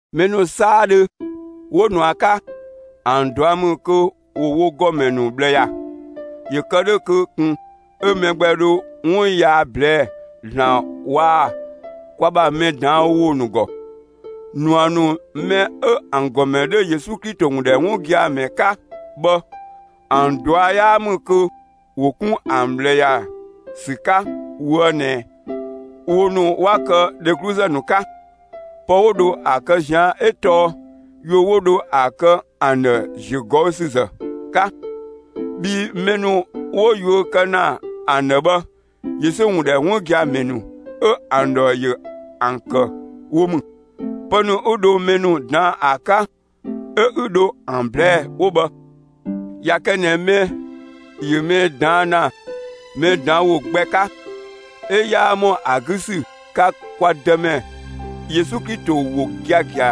Mɛ ‑nu 'saadhö 'wo ꞊nua 'ka, ‑an ꞊dua' ‑mü kö ‑wo wo ‑gɔmɛ ‑nu ꞊bhlë ‑ya. ‑Yö kë 'dhö kö ꞊kun 'ö mɛ gbɛ dho 'wun yaa ꞊blɛɛ'‑ ‑Zlan waa‑ kwa ‑bha mɛ ꞊daan' ‑wo ‑nu ‑gɔ. ꞊Nua ‑nu mɛ 'ö ‑an ‑gɔmɛ 'dhö Yesu Klito ‑wun ‑dhɛ 'wun gia‑ ‑mɛ 'ka bhë, ‑an ꞊dua' 'yaa ‑mü kö ‑wo 'kun ‑an ꞊bhlë ‑ya ‑sü 'ka ꞊woë' ꞊nɛ wo ‑nu 'wa kë dhegluzë ‑nu 'ka. Pë 'wo dho ‑a kë ꞊zian' 'ö tɔɔ yuö 'wo dho ‑a kë ‑an ‑dhë ‑ziögɔüsüzë 'ka. Bhii mɛ ‑nu 'wo yuö kë ‑na ‑an ‑dhë bhë, Yesu ‑wun ‑dhɛ 'wun gia‑ ‑mɛ ‑nu 'ö ‑an ‑dhɔ ‑yö ‑an ‑kë wo ‑mü. Pë ‑nu 'ü dho mɛ ‑nu ꞊daan'‑ ‑a 'ka 'ö 'ü dho ‑an ꞊blɛɛ'‑ 'wo bhë. ꞊Ya kë ꞊nɛ mɛ ‑yö mɛ ꞊daan' ‑na mɛ ꞊daan' ‑wo gbɛ 'ka, 'ö 'yaa ‑mɔ ‑a 'gü ‑sü 'ka kwa Dëmɛ Yesu Klito ‑wo giagia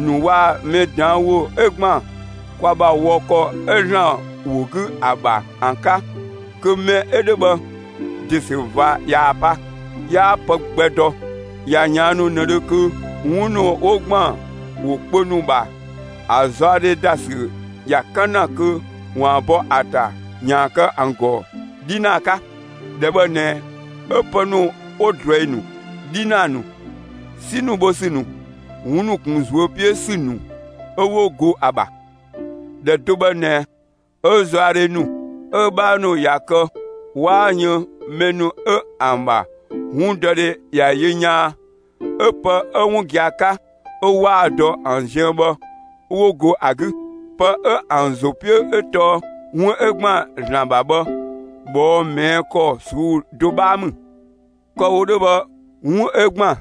‑nu waa‑ mɛ ꞊daan' ‑wo 'ö ‑gban kwa ‑bha wɔ ‑kɔ 'ö ‑Zlan ‑wo 'gü ‑a ‑bha ‑an 'ka, kö mɛ 'ö 'dhö bhë, ‑de ‑sü ꞊va ꞊yaa‑ pa, 'yaa pë gbɛ dɔ; ꞊ya ꞊yaannu ꞊nëdhö kö 'wun ‑nu 'wo ‑gban ‑wo kpö ‑nu ‑bha ‑a zaɔdhe ‑da ‑sü ‑ya 'kan ‑na kö ‑waan bɔ ‑a ‑ta ‑yaan kë ‑an ‑gɔ 'dhinaa 'ka. ‑Dhɛ bhë ꞊nɛ 'ö pë ‑nu 'wo ꞊druɛi ‑nu, 'dhinaa ‑nu, 'si ‑nu bho ‑sü ‑nu, 'wun ‑nu ‑kun ꞊zuö' 'piö ‑sü ‑nu 'ö 'wo go ‑a ‑bha; ‑Dhɛ do bhë ꞊nɛ 'ö zaɔdhe ‑nu 'ö‑ 'bhaa ‑nu ꞊ya kë 'waa yën mɛ ‑nu 'ö ‑an ‑bha 'wundɔdhe ꞊ya yö yaan 'ö pë 'ö 'wun gia‑ 'ka, 'ö 'waa‑ dɔ ‑an ziën bhë 'wo go ‑a 'gü. Pë 'ö ‑an ‑zo 'piö 'ö tɔɔ 'wun 'ö ‑gban ‑Zlan ‑bha bhë, ꞊bhɔɔ' ꞊mɛɛ' ‑kɔ ꞊suu'‑ do 'bhaa ‑mü. Kë‑ wo 'dhö bhë 'wun 'ö ‑gban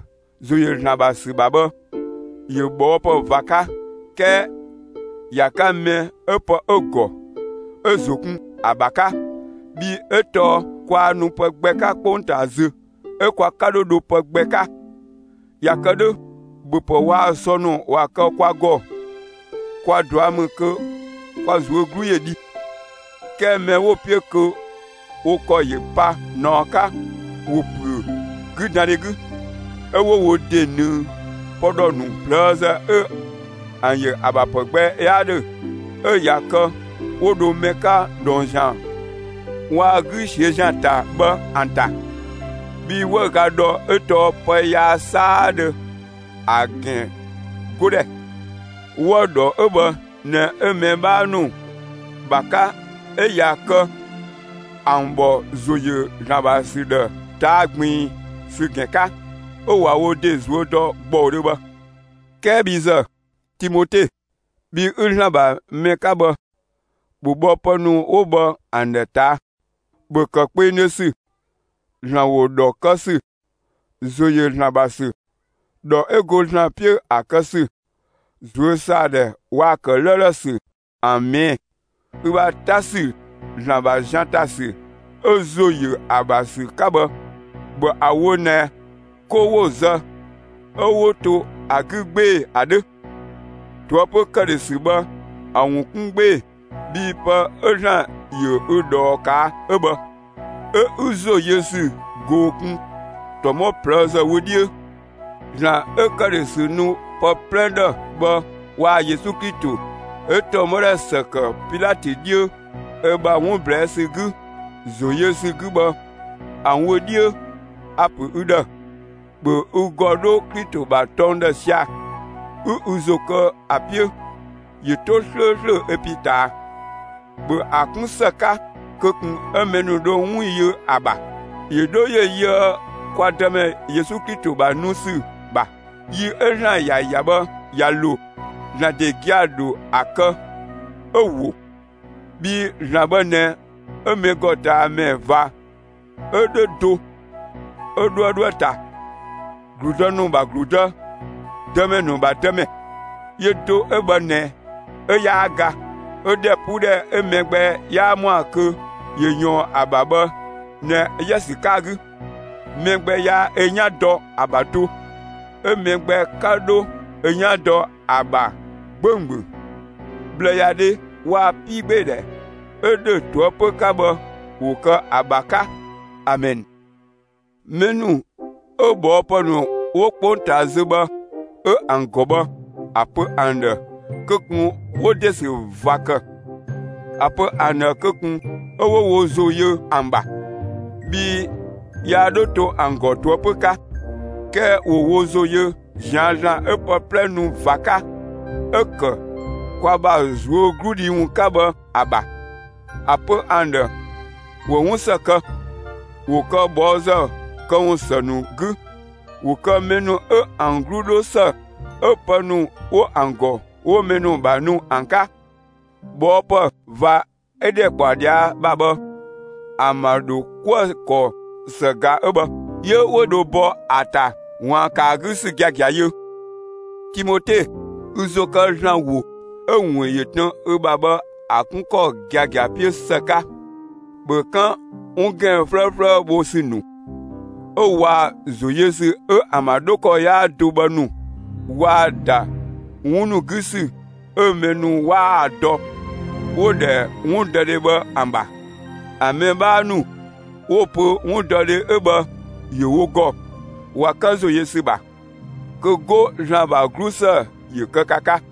‑zo ‑yö ‑Zlan ‑bha ‑sü ‑bha bhë, ‑yö ꞊bhɔɔpë ꞊va 'ka; 'kɛɛ ‑ya 'ka mɛ 'ö pë 'ö‑ ‑gɔ 'ö‑ ‑zo kun ‑a ‑bha 'ka. Bhii 'ö tɔɔ kwaa nu pë gbɛ 'ka 'kpongtaa zö, 'ö kwa 'ka 'dho dho pë gbɛ 'ka. ꞊Ya kë 'dhö ‑bhöpë waa‑ sɔ ‑nu ꞊wa kë kwa ‑gɔ, kwa ꞊dua' ‑mü kö kwa ꞊zuö' 'glu ‑yö dhi. 'Kɛɛ mɛ 'wo‑ 'piö kö wo ‑kɔ ‑yö pa ꞊naɔ 'ka, ‑wo ‑püö 'güdandhe 'gü, 'ö 'wo wo ‑de ꞊nëng pë ‑dhɔ ‑nu ꞊plëëzë 'ö ‑an ‑yö ‑a ‑bha ‑pë gbɛ 'yaa 'dhö 'ö ꞊ya kë 'wo dho mɛ 'ka dhɔng ‑zian waa‑ 'gü ꞊siö' ‑zian ‑ta bhë ‑an ‑ta. Bhii 'wëüga ‑dhɔ 'ö tɔɔ pë yaa 'saadhö ‑a ‑gɛn 'godhɛ. 'Wëü‑ ‑dhɔ 'ö bhë ꞊nɛ 'ö mɛ 'bhaa ‑nu ‑bha 'ka 'ö ꞊ya kë ‑an ‑bhɔ ‑zo ‑yö ‑Zlan ‑bha ‑sü ‑dhë ꞊taa' ꞊gbiin ‑sü ‑gɛn 'ka 'ö ꞊wa wo ‑de ꞊zuö' ‑dɔ ‑gbɔudhö bhë. 'Kɛɛ bhi ‑zë, (Timote), bhi 'ü ‑Zlan ‑bha mɛ 'ka bhë, ‑bhö bhɔ pë ‑nu 'wo bhë ‑an ‑dhë ꞊taa'! ‑Bhö ‑kë kpengdhö ‑sü, ‑Zlan ‑wo ‑dhɔ kë ‑sü, ‑zo ‑yö ‑Zlan ‑bha ‑sü, ‑dhɔ 'ö go ‑Zlan 'piö ‑a kë ‑sü, ꞊zuösaadhɛ waa‑ ‑kë 'lëëlë ‑sü ‑an ꞊mɛɛ'‑. Ü ‑bha 'ta ‑sü ‑Zlan ‑bha zian ‑ta ‑sü 'ö ‑zo ‑yö ‑a ‑bha ‑sü 'ka bhë, ‑bhö ‑a ‑wo ꞊nɛ 'ko 'wo‑ zë 'ö 'wo to ‑a 'gü 'gbee‑ ‑a 'dhö! ꞊Toëpö ‑këdhösü bhë ‑a ‑wun 'kun 'gbee‑, bhii pë 'ö ‑Zlan ‑yö ü ꞊dhɔɔ ꞊kaa' 'ö bhë, 'ö 'ü ‑zo yö ‑sü ꞊goo‑ kun ‑tɔmɔ ꞊plëëzë wö 'dhiö. ‑Zlan 'ö ‑këdhösü ‑nu pë 'plɛ ‑dhë bhë waa‑ Yesu Klito 'ö ‑tɔmɔdhɛ ‑së ‑kë Pilatö 'dhiö ö ‑bha 'wun ꞊blɛɛ' ‑sü 'gü ‑zo ‑yö ‑sü 'gü bhë ‑an wö 'dhiö, a‑ ‑pö ü ‑dhë: ‑Bhö ü ‑gɔ 'dho Klito ‑bha tɔng ‑dhë sia‑, 'ü ü ‑zo kë ‑a 'piö, ‑yö 'to 'slööslö ö pin ꞊taa. ‑Bhö ‑a 'kun ‑së 'ka kö ꞊kun 'ö mɛ ‑nu dho 'wun yö ‑a ‑bha, ‑yö 'dho ‑yö yöë kwa Dëmɛ Yesu Klito ‑bha nu ‑sü ‑bha. Yi 'ö ‑Zlan ‑ya ‑ya bhë ꞊ya ‑lo, ‑Zlan ‑de gia‑ ‑dho ‑a kë 'ö ‑wo. Bhii ‑Zlan bhë ꞊nɛ 'ö mɛgɔtamɛ ꞊va 'ö 'dhö do, 'ö 'dhuë‑ 'dhoë‑ ‑ta, ‑gludë ‑nu ‑bha ‑Gludë, dëmɛ ‑nu ‑bha Dëmɛ. Yö do 'ö bhë ꞊nɛ 'ö 'yaa ga, 'ö ‑dhɛpuudhɛ 'ö mɛ gbɛ 'yaa ‑mɔa kö ‑yö ꞊yɔɔn ‑a ‑bha bhë ꞊nɛ 'ö ‑ya ‑sü 'ka‑ 'gü. Mɛ gbɛ yaa ö 'yan dɔ ‑a ‑bha do, 'ö mɛ gbɛ 'ka 'dho ö 'yan dɔ ‑a ‑bha 'gbönggböng. ꞊Bhlëyadhe waa‑ 'piigbeedhɛ 'ö ‑dhö ꞊toëpö 'ka bhë, ‑wo kë ‑a ‑bha 'ka! Amɛn. Mɛ ‑nu 'ö ꞊bhɔɔpë ‑nu 'wo 'kpongtaa zö bhë 'ö ‑an ‑gɔ bhë, ‑a pö ‑an ‑dhë kö ꞊kun 'wo ‑de ‑sü ꞊va ‑kë. ‑A pö ‑an ‑dhë kö ꞊kun 'ö 'wo wo ‑zo yö ‑an ‑bha, bhii yaa 'dho to ‑an ‑gɔ ꞊toëpö 'ka; 'kɛɛ ‑wo wo ‑zo yö ꞊zian' ‑Zlan 'ö pë 'plɛ nu ꞊va 'ka, 'ö ‑kë kwa ‑bha ꞊zuögludhi ‑wun 'ka bhë ‑a ‑bha. ‑A pö ‑an ‑dhë ‑wo 'wun ‑së kë, ‑wo kë ꞊bhɔɔzë këwun ‑së ‑nu 'gü; ‑wo kë mɛ ‑nu 'ö ‑an 'glu 'dho ‑së 'ö pë ‑nu 'wo ‑an ‑gɔ, 'wo mɛ ‑nu ‑bha ‑nu ‑an 'ka. ꞊Bhɔɔpë ꞊va 'ö ‑dhɛkpaɔyi ꞊dhia' ‑bha bhë, ‑an ‑bha ‑dho 'kuë‑ ‑kɔ ‑së ꞊ga 'ö bhë; 'yö 'wo dho bɔ ‑a ‑ta ‑waan ‑kë ‑a 'gü ‑sü giagia yö. Timote, ü ‑zo kë ‑Zlan ‑wo 'ö‑ ‑wun ‑yö tën ü ‑bha bhë ‑a 'kun ‑kɔ giagia 'piö ‑së 'ka; ‑bhö 'kan 'wun ‑gɛn 'flëëflëë bho ‑sü ‑nu 'ö waa‑ ‑zo yö ‑sü 'ö ‑an ‑bha 'dho ‑kɔ 'yaa do bhë ‑nu waa‑ ‑da 'wun ‑nu 'gü ‑sü 'ö mɛ ‑nu 'waa‑ dɔ 'wo‑ ‑dhɛ 'wundɔdhe bhë ‑an ‑bha! ‑A mɛ 'bhaa ‑nu 'wo‑ pö 'wundɔdhe 'ö bhë ‑yö wo ‑gɔ, ꞊wa 'kan ‑zo yö ‑sü ‑bha. Kö 'go, ‑Zlan ‑bha 'glusë ‑yö kë ka 'ka!